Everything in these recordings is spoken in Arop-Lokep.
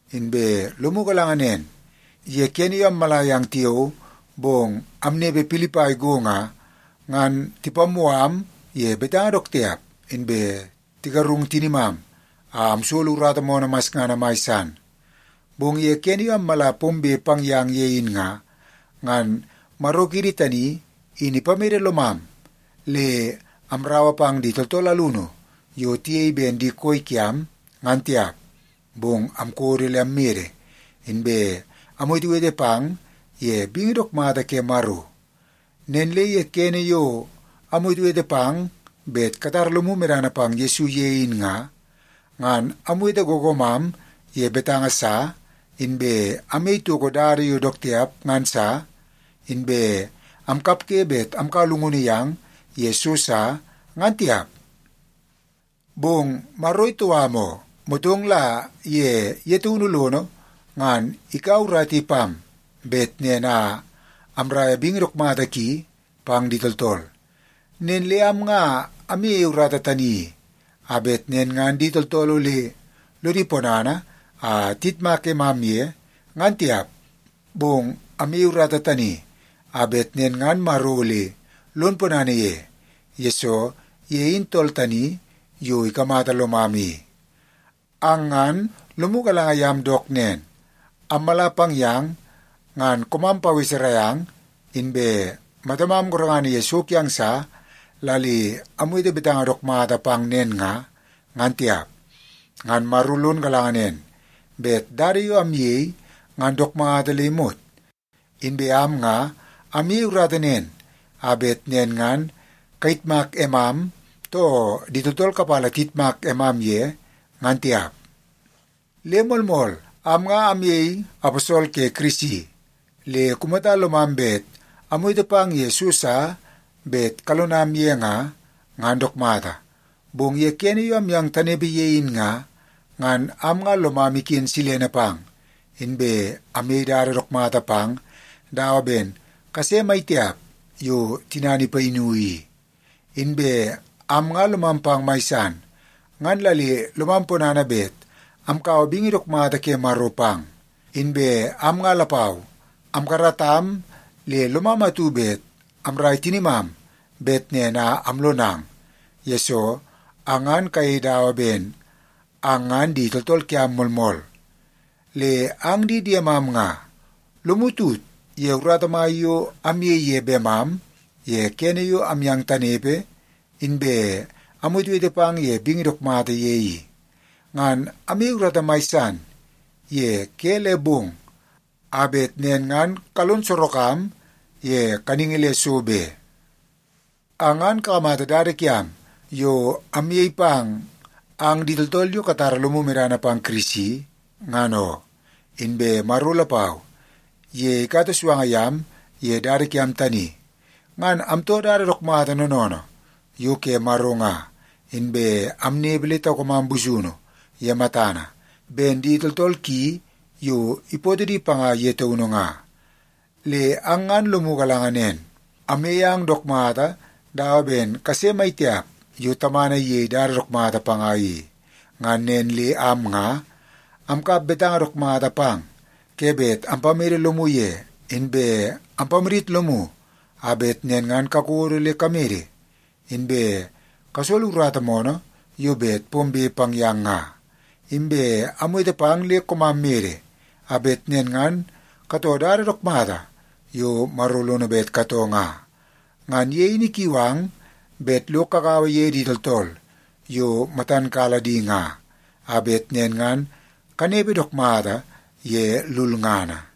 Inbe lomu galanga nen, ye kene yo ammala yang tiao, bong amnepe Pilipai go nga, ngan tipammoo am ye betanga dook tiap, inbe tigarung tinimam a amsolo urata moonoo masngana mai san. Bong ye kene yo ammala pombe pang yang ye in nga, ngan Maro kiidi tani in ipamede lomam le amraua pang di tooltool alunu yo tiyei ben di koi kiam, ngan tiap. Bong amkodo le ammede, inbe amwetewete pang ye bingi dook mata ke Maro. Nen le ye kene yo amwetewete pang bet katara lomu medana pang Yesu ye in nga, ngan amwete googoomam ye betanga sa, inbe amyei toko dada yo dook tiap ngan sa, inbe amkapge bet amkaua llungunu yang ye so sa, ngan tiap. Bong Maro itou am oo, motong la ye ye taunu lono ngan ikaua urata i pam bet nen a amraia bingi dook mata ki pang di tooltool. Nen le am nga amyeie urata tani i, a bet nen ngan di tooltool ole lodi ponana a tiyitmak emam ye, ngan tiap. Bong amyeie urata tani a bet nen ngan Maro ole lon ponana ye, yesoo ye in tool tani yo ikamata lomam i. Ang ngan lomu galanga yam dook nen, ammala pang yang ngan koomam paweserai ang, inbe matamam gorengana ye so kiang sa la le amwete betanga dook mata pang nen nga, ngan tiap. Ngan Maro lon galanga nen bet dada yo amyei ngan dook mata le imot. Inbe am nga amyei urata nen a bet nen ngan kayitmak emam, too di tooltool kapala tiyitmak emam ye, ngan tiap. Le moolmool, am nga amyei aposol ke Kirisi, le kumata lomam bet amwete pang ye so sa bet kalonam ye nga, ngan dook mata. Bong ye kene yo amyang tanepe ye in nga, ngan am nga lomam iken silene pang, inbe amyei dada dook mata pang dawa ben kase maitiap yo tinana ipayinu i. Inbe am nga lomam pang mai san, ngan la le lomam ponana bet amkaua bingi dook mata ke Maro pang. Inbe am nga lapau amkaratam le lomam atu bet amrai tinimam bet nen a amlonang, yesoo ang ngan kayei dawa ben ang ngan di tooltool kiam moolmool. Le ang di diemam nga, lomu tut ye urata mai yo amyei ye bemam ye kene yo amyang tanepe, inbe amwetewete pang ye bingi dook mata ye i. Ngan amyei urata mai san ye ke le bong a bet nen ngan kalon sorok am ye kaningi le so be. Ang ngan kakamata dada kiam yo amyei pang ang di tooltool yo katara lomu medana pang Kirisi, ngan oo. Inbe Maro lapau, ye ikata suanga yam ye dada kiam tani. Ngan amtoo dada dook mata noonoonoo yo ke Maro nga, inbe amnepe le taukamam busunu ye matana ben di tooltool ki yo ipootoo di panga ye taunu nga. Le ang ngan lomu galanga nen, amyei ang dook mata dawa ben kase maitiap yo tamana iyei dada dook mata panga i. Ngan nen le am nga amkap betanga dook mata pang ke bet ampamede lomu ye, inbe ampamadit lomu a bet nen ngan kakodo le kamede inbe kasolo urata moonoo yo bet pombe pang yang nga. Inbe amwete pang le koomam mede, a bet nen ngan katoo dada dook mata yo Maro lono bet katoo nga. Ngan ye in ikiu ang bet lo kagaua ye di tooltool yo matan kala di nga, a bet nen ngan kanepe dook mata ye lulngana.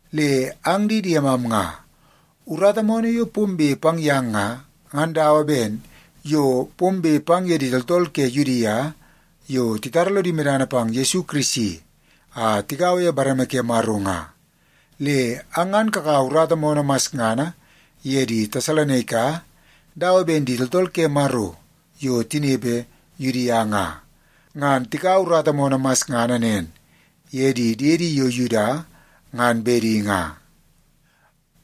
Le ang di diemam nga, urata moonoo yo pombe pang yang nga, ngan dawa ben yo pombe pang ye di tooltool ke Yudia yo titara lodi medana pang Yesu Kirisi a tigaua ye bareme ke Maro nga. Le ang ngan kakaua urata moonoo masngana ye di Tesalonaika dawa ben di tooltool ke Maro yo tinepe Yudia nga, ngan tikaua urata moonoo masngana nen ye di diedi yo Yuda ngan bedi nga.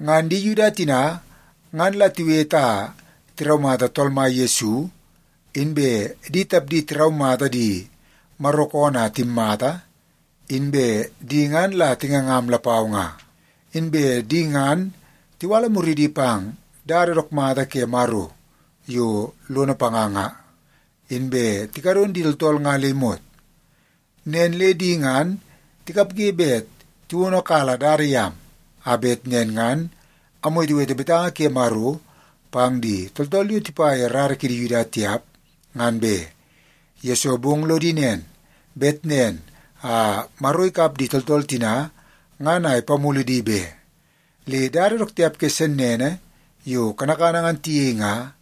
Ngan di Yuda tina, ngan la tiwete a tiraumata Tool Mai Yesu, inbe di tapdi tiraumata di Maro koonoo a timmata, inbe di ngan la tingangam lapau nga. Inbe di ngan tiwala muridi pang dada dook mata ke Maro yo lono panga nga, inbe tikadon di tooltool nga le imot. Nen le di ngan tikapge bet tiwonokala dada yam, a bet nen ngan amwetewete betanga ke Maro pang di tooltool yo tipa ye rara kidi Yuda tiap, ngan be. Yesoo bong lodi nen, bet nen a Maro ikap di tooltool tina ngan a ipamulu di be. Le dada dook tiap ke sennene yo kanakana ngan tiyei nga,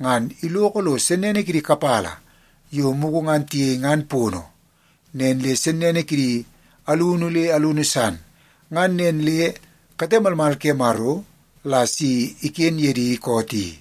ngan iloko lo sennene kidi kapala yo mugu ngan tiyei ngan pono, nen le sennene kidi alunu le alunu san. Ngan nen le kate malmal ke Maro la si iken ye di koot i.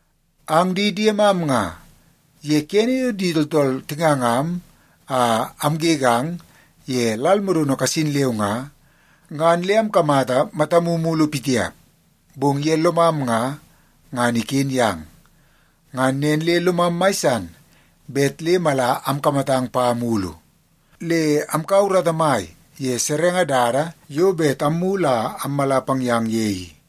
Ang di diemam nga, ye kene yo di tooltool tingangam a amgegang ye lal modono kasin leu nga, ngan le amkamata matamu mulu pitiap, bong ye lomam nga, ngan iken yang. Ngan nen le lomam mai san bet le mala amkamatang pa mulu. Le amkaua urata mai ye serenge dada yo bet ammulu a ammala pang yang ye i.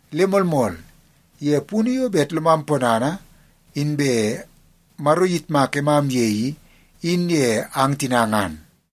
Le moolmool, ye punu yo bet lomam ponana inbe Maro iyitmak emam ye i, in ye ang tina ngan.